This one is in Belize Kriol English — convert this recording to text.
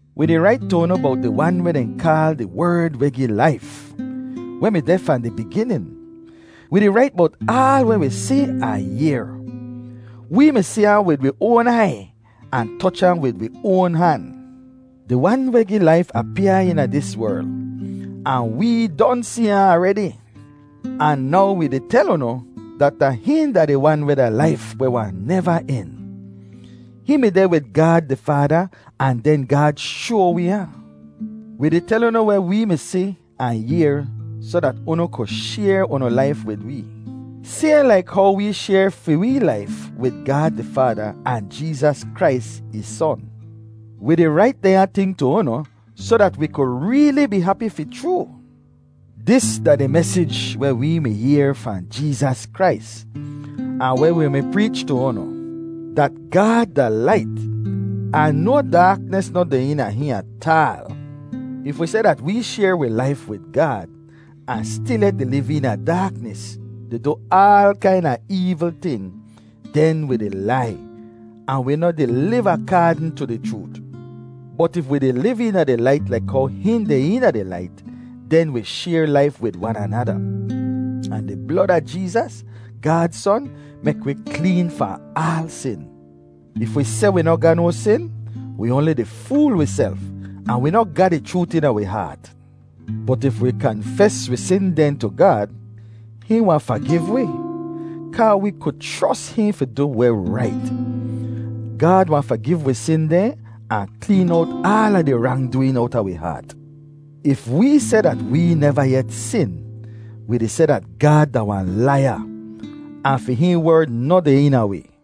Wi di rait tu unu bowt di Wan weh dehn kaal “di Werd weh gi laif,” weh mi deh fahn di biginin. Wi di rait bowt aal weh wi si ahn yehr. Wee mi si ahn wid wi oan aiy ahn toch ahn wid wi oan han. Di Wan weh gi laif apyaa eena dis werl, ahn wee don si ahn aredi. Ahn now wi di tel unu, dat da hihn da di Wan weh da laif weh wahn neva en. Hihn mi deh wid Gaad di Faada ahn den Gaad shoa wi ahn. Wi di tel unu weh wee mi si ahn yehr soh dat unu ku shayr unu laif wid wee, sayhn laik how wee shayr fi wee laif wid Gaad di Faada ahn Jeezas Krais, ih Son. Wi di rait dehnya ting tu unu soh dat wi ku reeli bee hapi fi chroo. Dis da di mesij weh wee mi yehr fahn Jeezas Krais, ahn weh wi mi preech tu unu, dat Gaad da lait, ahn no daaknis noh deh eena hihn ataal. If wi seh dat wee shayr wi laif wid Gaad ahn stilyet di liv eena daaknis, di du aal kaina eevl ting, den wi di lai, ahn wi noh di liv akaadn tu di chroot. Bot if wi di liv eena di lait laik how hihn deh eena di lait, den wi shayr laif wid wan anada, ahn di blod a Jeezas, Gaad Son, mek wi kleen fahn aal sin. If wi seh wi noh ga no sin, wi oanli di fool wiself, ahn wi noh ga di chroot eena wi haat. Bot if wi kanfes wi sin dehn tu Gaad, hihn wahn fagiv wi, kaa wi ku chros hihn fi du weh rait. Gaad wahn fagiv wi sin dehn ahn kleen owt aala di rangdooin owta wi haat. If wee seh dat wee neva yet sin, wi di seh dat Gaad da wahn laiya, ahn fi hihn Werd noh deh eena wi.